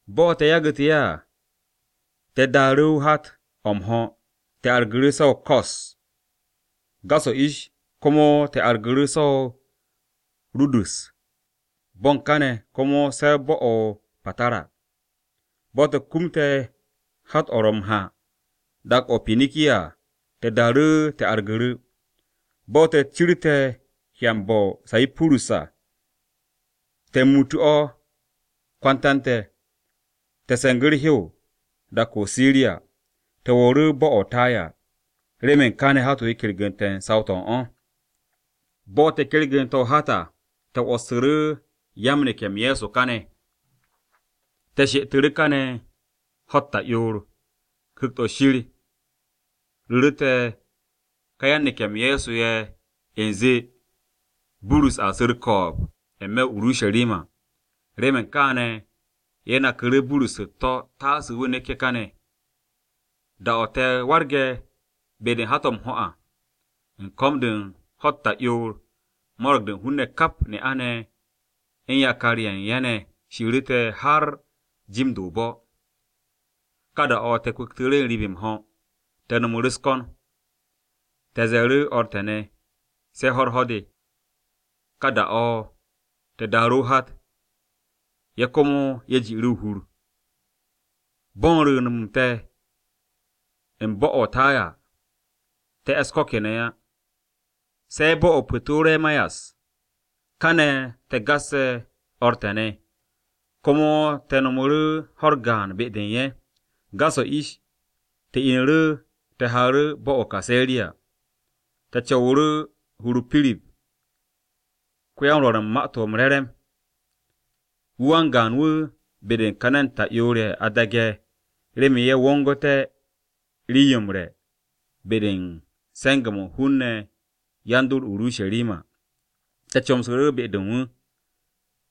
Bo̱ te̱ yagu̱tu̱ ye̱ à, te̱ daaru̱ hat-o̱ m-ho̱ te̱ argu̱ru̱ se̱ o-Ko̱s. Gas-o̱ ish komo te̱ argu̱ru̱ se̱ o-Rodu̱s, bo̱ u̱n kane̱ komo se̱ bo̱-o̱ o-Patara. Bo̱ te̱ kumte̱ hat-o̱ ro̱ m-ha dak-o̱ o-Pinikiya à, te̱ daaru̱ te̱ argu̱ru̱. Bo̱ te̱ cirte̱ hyanbe̱ o-Sayipurus à, te̱ muutu̱ o̱ kwanta u̱n te̱. Te̱ se̱ngu̱ u̱r-hew dak-o̱ o-Siriya, te̱ wo̱o̱ru̱ bo̱-o̱ o-Taya, remen ka be-de hat-o he m-kergu̱nte̱ u̱n saw-to̱ u̱n o̱. Bo̱ te̱ kergu̱nte̱ o-hat à, te̱ 'wo̱ssu̱ru̱ yan-neke̱-m Ye̱so káne̱. Te̱ she'etu̱ru̱ kane̱ ho̱-u̱t ta'yoor. Ku̱kt-o̱ Shir ru̱ru̱te̱ ka yan-neke̱-m Ye̱so ye̱ u̱nze Burus a su̱ u̱r-ko̱o̱b n-me̱ o-Urusharima. Remen kaane̱, ye̱ naku̱ru̱ Burus u̱t-to̱ taase wu̱ neké̱ káne̱. Da-o̱ te̱ warge̱ be-de u̱n hat-o̱ m-ho̱ à, u̱n ko̱m-de u̱n ho̱-u̱t ta'yoor, mo̱ro̱g-de u̱n hun-ne̱ kap ne'a-ne̱ u̱n yakar-ye̱ u̱n ye̱ ne̱ shiiru̱ te̱ har jim-de o-bo̱. Ka da-o̱ te̱ kwu̱ktu̱ru̱ n-riib m-ho̱, te̱ no̱mu̱ru̱ u̱s-ko̱n. Te̱ ze̱e̱ru̱ o̱r te̱ ne̱, se̱ ho̱-u̱r ho̱r-de. Ka da-o̱, te̱ daaru̱ o-hat, ye̱ komo ye̱ ji'u̱ru̱ o-hur. Bo̱ u̱n rwu̱u̱n-m te̱ u̱n bo̱-o̱ o-Taya, te̱ e̱s ko̱ kene̱ á, se̱ bo̱-o̱ o-Pu̱toremayas. Kane̱, te̱ gasse̱ o̱r te̱ ne̱, komo te̱ rewu̱ ho̱-u̱r gaan be-de u̱n ye̱. Gas-o̱ ish, te̱ inu̱ru̱ te̱ haaru̱ bo̱-o̱ o-Kaseriya. Te̱ co̱wu̱ru̱ hur-o Pirip ko-ya-m-Rwo̱r u̱n Ma-to̱ m-Re̱re̱m. Wu̱ wan-gaan-wu̱ be-de u̱n ka ne̱n ta'yoor-ye̱ a daage̱ remen ye̱ wo̱ngté̱ rii-yo m-re̱ be-de u̱n se̱nge̱-mo̱ u̱n hun-ne̱ yan-dor o-Urusharima. Te̱ comsu̱ru̱ be-de u̱n wu̱.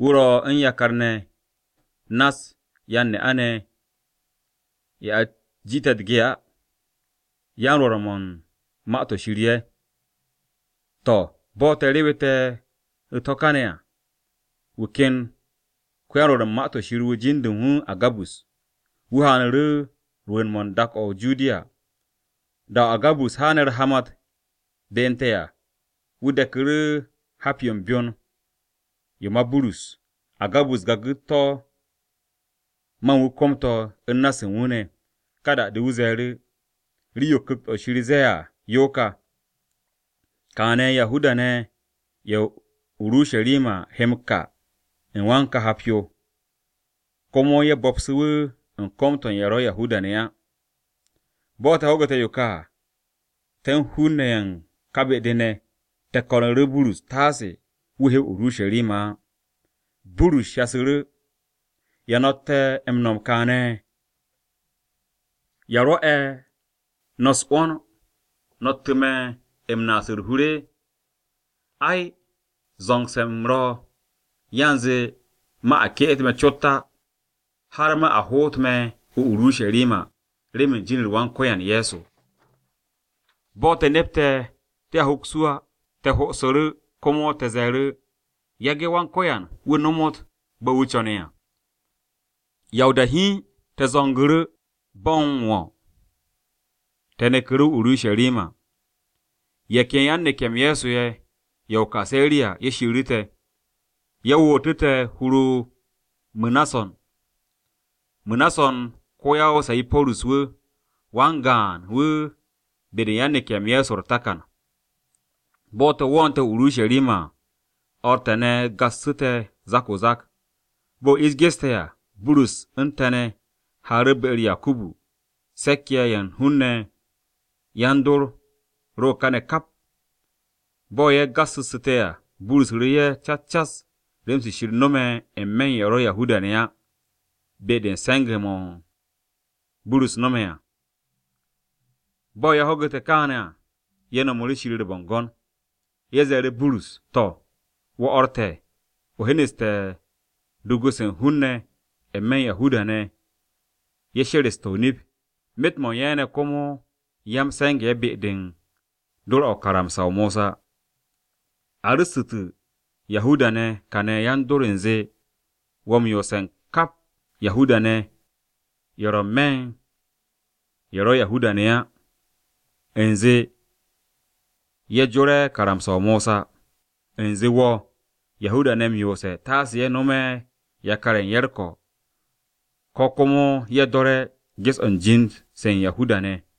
Wu̱ ro̱ u̱n yakar-ne̱ nass yan-ne'a-ne̱, ye̱ a jiite̱ u̱t-ge á. Ye̱ yan-Rwo̱r u̱n Ma-to̱ Shir ye̱. To̱, bo̱ te̱ rewete̱ u̱t-ho̱ kane̱ à, wu̱ ken ko-yan-Rwo̱r u̱n Ma-to̱ Shir wu̱ jin-de u̱n wu̱ Agabus. Wu̱ haanu̱ru̱ rwu̱u̱n-mo̱ u̱n dak-o̱ o-Judiya. Da-o̱ Agabus haane̱ u̱r-hamat be u̱n te̱ à, wu̱ deku̱ru̱ hap-yo u̱n byon-yo ma Burus. Agabus gagu̱ to̱ ma u̱n wu̱ kom-to̱ u̱n na-se u̱n wu̱ ne̱. Ka da-de wu̱ ze̱e̱ru̱, “Rii-yo Ku̱kt-o̱ Shir ze̱e̱ à yo ka, ‘Kaane̱ Yahuda-ne̱ ye̱ o-Urusharima he m-ka u̱n wan ka hap-yo, komo ye̱ bo̱psu̱ wu̱ u̱n kom-to̱ u̱n ye̱ ro̱ Yahuda-ne̱ á.’” Bo̱ te̱ ho̱gu̱te̱ yo ka à, te̱ u̱n hun-ne̱ ye̱ u̱n ka be-de ne̱, te̱ ko̱nu̱ru̱ Burus taase wu̱ he o-Urusharima á. Burus shasu̱ru̱, “¿Ya no̱tte̱ m-no̱m kaane̱? ¿Ya rwo̱'e̱ no̱ u̱s-'wo̱n no̱ttu̱ me̱ u̱n naas u̱r-hur? Ai, zo̱ngse̱ u̱m ro̱ yanze ma a ke'et me̱ cot á, har ma a hoot me̱ o-Urusharima remen jin-u̱r Wan-Ko̱yan Ye̱so.” Bo̱ te̱ nepte̱ te̱a hoks wu̱ á, te̱ ho'osu̱ru̱ komo te̱ ze̱e̱ru̱, “Yage̱ Wan-Ko̱yan wu̱ nomot bo̱ wu̱ co̱ne̱ à.” Ya o-da hiin, te̱ zo̱ngu̱ru̱ bo̱ m-wo̱, te̱ neku̱ru̱ o-Urusharima. Ye̱ ken yan-neke̱-m Ye̱so ye̱, ya-o-Kaseriya, ye̱ shiiru̱ te̱. Ye̱ wootu̱ te̱ hur-o Mu̱nason. Mu̱nason ko-ya-o-Sayipurus-wu̱, wan-gaan-wu̱ be-de u̱n yan-neke̱-m Ye̱so u̱r-takan. Bo̱ te̱ wo̱o̱nte̱ o-Urusharima à, o̱r te̱ ne̱ go̱ksu̱ te̱ o-zak o-zak. Bo̱ ish geste̱ à, Burus u̱n te̱ ne̱ haaru̱ be-u̱r Yakubu. Se̱k-ye̱ ye̱ u̱n hun-ne̱ yan-dor ro kane̱ kap. Bo̱ ye̱ gassu̱nsu̱te̱ à, Burus ru̱ru̱ ye̱ cas cas rem-se Shir no̱me̱ n-me̱ u̱n ye̱ ro̱ Yahuda-ne̱ á be-de u̱n se̱nge̱-mo̱ Burus no̱me̱ à. Bo̱ ye̱ ho̱gu̱te̱ kaane̱ à, ye̱ nomu̱ru̱ Shir u̱r-bo̱ngo̱n. Ye̱ ze̱e̱ru̱ Burus, “To̱, wo̱ o̱r te̱, o hyenu̱ste̱ dugu-se u̱n hun-ne̱ n-me̱ u̱n Yahuda-ne̱ ye̱ she̱re̱ste̱ o-nip, myet-mo̱ u̱n ye̱ ne̱ komo ya-m-se̱nge̱-ye̱ be-de u̱n do̱r-o̱ karamsa-o Mosa. A ru̱ssu̱tu̱ Yahuda-ne̱ kane̱ yan-dor u̱nze wo̱ m-yoose̱ u̱n kap Yahuda-ne̱, ye̱ ro̱ n-me̱ u̱n ye̱ ro̱ Yahuda-ne̱ á u̱nze ye̱ jore̱ karamsa-o̱ Mosa. U̱nze wo̱ Yahuda-ne̱ m-yoose̱ taase ko yakar-ye̱ u̱n ye̱ u̱r-ko̱, ko̱ komo ye̱ do̱re̱ ges-o̱ u̱n jind-se u̱n Yahuda-ne̱.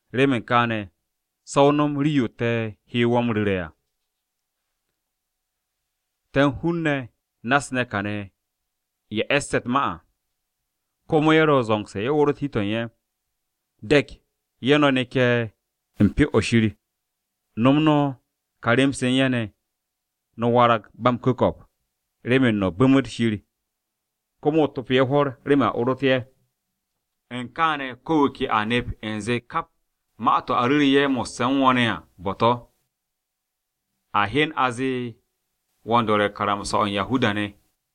Remen kaane̱, se̱ o nom rii-yo te̱ he wo̱ m-ru̱re̱ à. Te̱ u̱n hun-ne̱ nass ne̱ kane̱ ye̱ e̱sse̱ u̱t-ma à, komo ye̱ ro̱ zo̱ngse̱ ye̱ orot hi-to̱ u̱n ye̱. De̱k ye̱ no̱ neke̱ u̱n Pyo-o̱ Shir, no̱m no̱ ka rem-se u̱n ye̱ ne̱, no̱a warag ba m-ku̱ko̱p remen no̱ bu̱mu̱t Shir, komo o topo ye̱ hwo̱r remen a orot ye̱. U̱n kaane̱ ko̱ wu̱ ke a nep u̱nze kap ma-to̱ a ru̱ru̱ ye̱ mo̱sse̱ u̱n wo̱ ne̱ à bo̱-to̱, a hyen a zee wo̱ u̱n do̱re̱ karamsa-o̱ Yahuda-ne̱.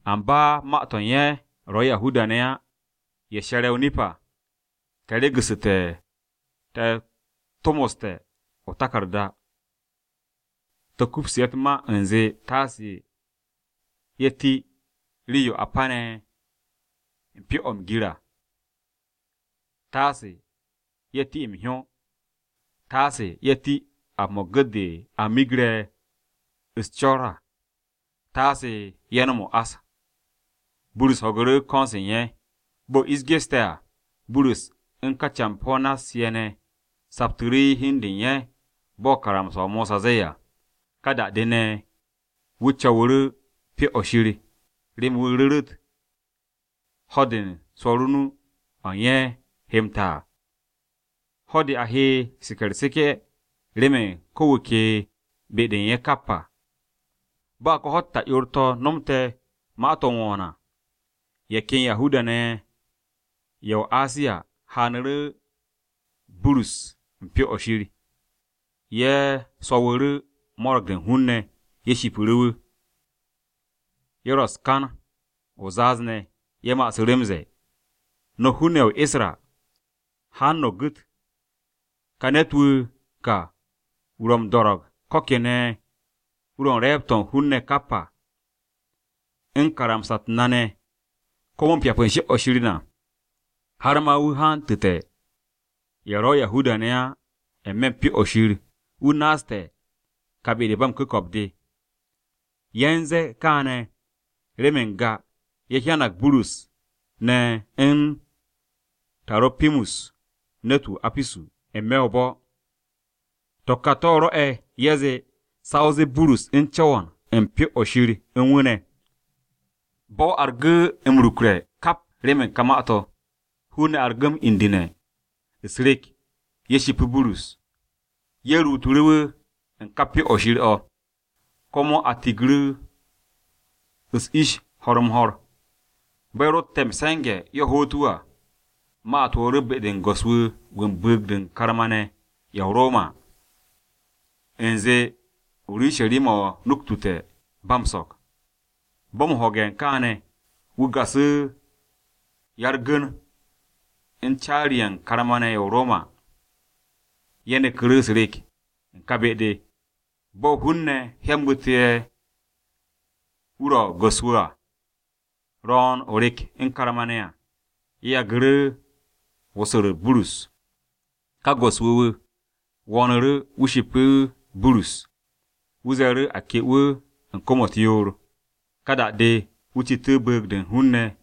Amba ma-to̱ u̱n ye̱ ro̱ Yahuda-ne̱ á ye̱ she̱re̱ o-nip à, te̱ regu̱ssu̱te̱ te̱ tomoste̱ o-taku̱rda. Te̱ kupsu̱ ye̱ u̱t-ma u̱nze, taase ye̱ ti rii-yo a pene̱ pyo-o̱ m-gir à, taase ye̱ ti m-hyó, taase ye̱ ti ap-mo̱ u̱n gu̱t-de a miggre̱ u̱s-co̱r à, taase ye̱ nom o-ás.” Burus ho̱gu̱ru̱ ko̱n-se u̱n ye̱. Bo̱ ish geste̱ à, Burus u̱n ka campo̱-ne̱ nass-ye̱ ne̱ saptu̱ru̱ hi u̱n de u̱n ye̱ bo̱ karamsa-o Mosa ze̱e̱ à. Ka da-de ne̱, wu̱ co̱wu̱ru̱ u̱n Pyo-o̱ Shir remen wu̱ ru̱ru̱t ho̱-de u̱n swo̱r o-nu o̱ u̱n ye̱ he m-ta à. Ho̱-de a he seke̱ u̱r-seke̱ remen ko̱ wu̱ ke be-de u̱n ye̱ kap à. Bo̱ ka ho̱-u̱t ta'yoor-to̱ nomte̱ ma-to̱ m-wo̱o̱n à, ye̱ ken Yahuda-ne̱ ye̱ ya-o-Asiya hyanu̱ru̱ Burus u̱n Pyo-o̱ Shir. Ye̱ swo̱wu̱ru̱ mo̱ro̱g-de u̱n hun-ne̱. Ye̱ shipiru̱ wu̱. Ye̱ ro̱ u̱s-kan o-zaaz ne̱, ye̱ ma'asu̱ m-ze̱e̱, “No̱ hun-ne̱ ye̱ o-Isra! Haan no̱ gwu̱! Ka ne̱t-wu̱ wu̱ ka wu̱ ro̱ m-do̱ro̱g ko̱ kene̱ wu̱ ro̱ u̱n re̱e̱b-to̱ u̱n hun-ne̱ kap à, u̱n karamsa-u̱t na ne̱, komo u̱n pyap u̱n Pyo-o̱ Shir na. Har ma wu̱ hantu̱te̱ ye̱ ro̱ Yahuda-ne̱ á n-me̱ u̱n Pyo-o̱ Shir wu̱ naasté̱ ka be-de ba m-ku̱ko̱p de.” Ye̱ u̱n ze̱e̱ kaane̱ remen n-ga, ye̱ hyanag Burus ne̱ u̱n Taro̱pimus, ne̱t-wu̱ o-Apisu, n-me̱ o-bo̱. To̱ ka to̱ rwo̱'e̱ ye̱ zee sa o zee Burus u̱n co̱wo̱n u̱n Pyo-o̱ Shir u̱n wu̱ ne̱. Bo̱-o argu̱ m-rukre̱ kap remen ka ma-to̱, hun-ne̱ argu̱ m-indu̱ne̱. U̱s-rek, ye̱ shipu̱ Burus, ye̱ ruutu̱ wu̱ u̱n ka Pyo-o̱ Shir o̱, komo a tigu̱ru̱ u̱s-ish ho̱r-m-ho̱r. Bo̱ ye̱ rotte̱ m-se̱nge̱ ye̱ hoot wu̱ à, ma-u̱t wo̱o̱ru̱ be-de u̱n go̱s-wu̱ wu̱ u̱n bu̱u̱g-de u̱n karma-ne̱ ye̱ o-Roma à, u̱nze Urusharima-o nuktute̱ ba m-so̱k. Bo̱ m-ho̱ge̱ u̱n kaane̱, wu̱ gasu̱ ya-u̱r-gu̱n u̱n caari-ye̱ u̱n karma-ne̱ ne̱ ye̱ o-Roma. Ye̱ neku̱ru̱ u̱s-rek u̱n ka be-de. Bo̱ hun-ne̱ hyambu̱te̱ wu̱ ro̱ go̱s-wu̱ à, ro̱o̱n o-rek u̱n karma-ne̱ à, ye̱ yagu̱ru̱ wosor-u̱t Burus. Ka go̱s-wu̱ wu̱ wo̱o̱nu̱ru̱, wu̱ shipu̱ Burus. Wu̱ ze̱e̱ru̱ a ke wu̱ u̱n kwo̱m-u̱t yoor. Ka da-de, wu̱ citu̱ bu̱u̱g-de u̱n hun-ne̱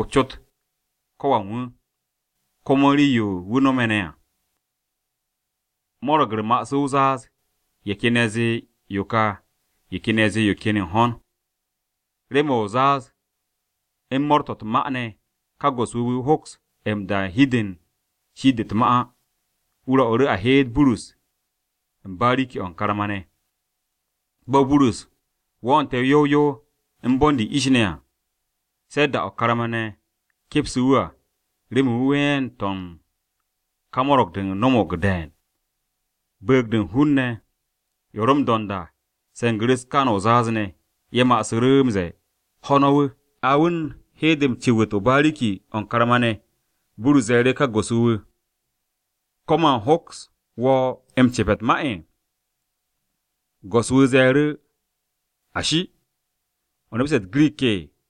o-cot ko̱ wan wu̱, komo u̱n rii-yo wu̱ no̱me̱ ne̱ à. Mo̱ro̱g-u̱r ma'asu̱ o-zaaz, ye̱ ken ye̱ zee yo ka, ye̱ ken ye̱ yo ken yo u̱n hon. Remen o-zaaz u̱n mo̱o̱r-to̱ u̱t-ma ne̱ ka go̱s-wu̱ wu̱ hoks m-da hi-de u̱n shi'it-de u̱t-ma á. Wu̱ rwo̱'u̱ru̱ a heet Burus u̱n bariki-o̱ u̱n karma-ne̱. Bo̱ Burus wo̱o̱nte̱ yow yow u̱n bo̱n-de ish ne̱ à, se̱ da-o̱ karma-ne̱ kepsu̱ wu̱ à remen ween-to̱ u̱n ka mo̱ro̱g-de no̱mo̱g de̱e̱n. Bu̱u̱g-de u̱n hun-ne̱, ye̱ ro̱ m-do̱nd à, se̱ngu̱ru̱ u̱s-kan o-zaaz ne̱, ye̱ ma'asu̱ru̱ m-ze̱e̱, “Ho̱ no̱ wu̱, ho̱ no̱ wu̱!” A wu̱ u̱n he-de m-cu̱wu̱t o-bariki o̱ u̱n karma-ne̱, Burus ze̱e̱ru̱ ka go̱s-wu̱ wu̱, “¿Ko̱ man u̱n hoks wo̱ m-cepe̱ u̱t-ma?” Go̱s-wu̱ ze̱e̱ru̱, “Ashi! ¿O nepste̱ u̱t-Girik?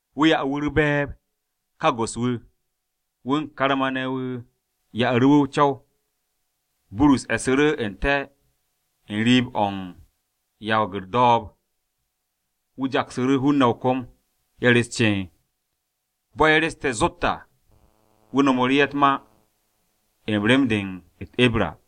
Wu̱ ya'u̱ wu̱ u̱r-be̱e̱b, ka go̱s-wu̱, wu̱ u̱n karma-ne̱ wu̱ ya'u̱ru̱ wu̱ o-co̱w. Burus e̱su̱ru̱ n-te̱ u̱n rii-o̱ m-yawag u̱r-do̱o̱b, wu̱ jaksu̱ru̱ hun-ne̱ o-kom, ye̱ re̱s ceen. Bo̱ ye̱ re̱ste̱ zot à, wu̱ nomoru̱ ye̱ u̱t-ma u̱n rem-de ye̱ de u̱t-Ibra.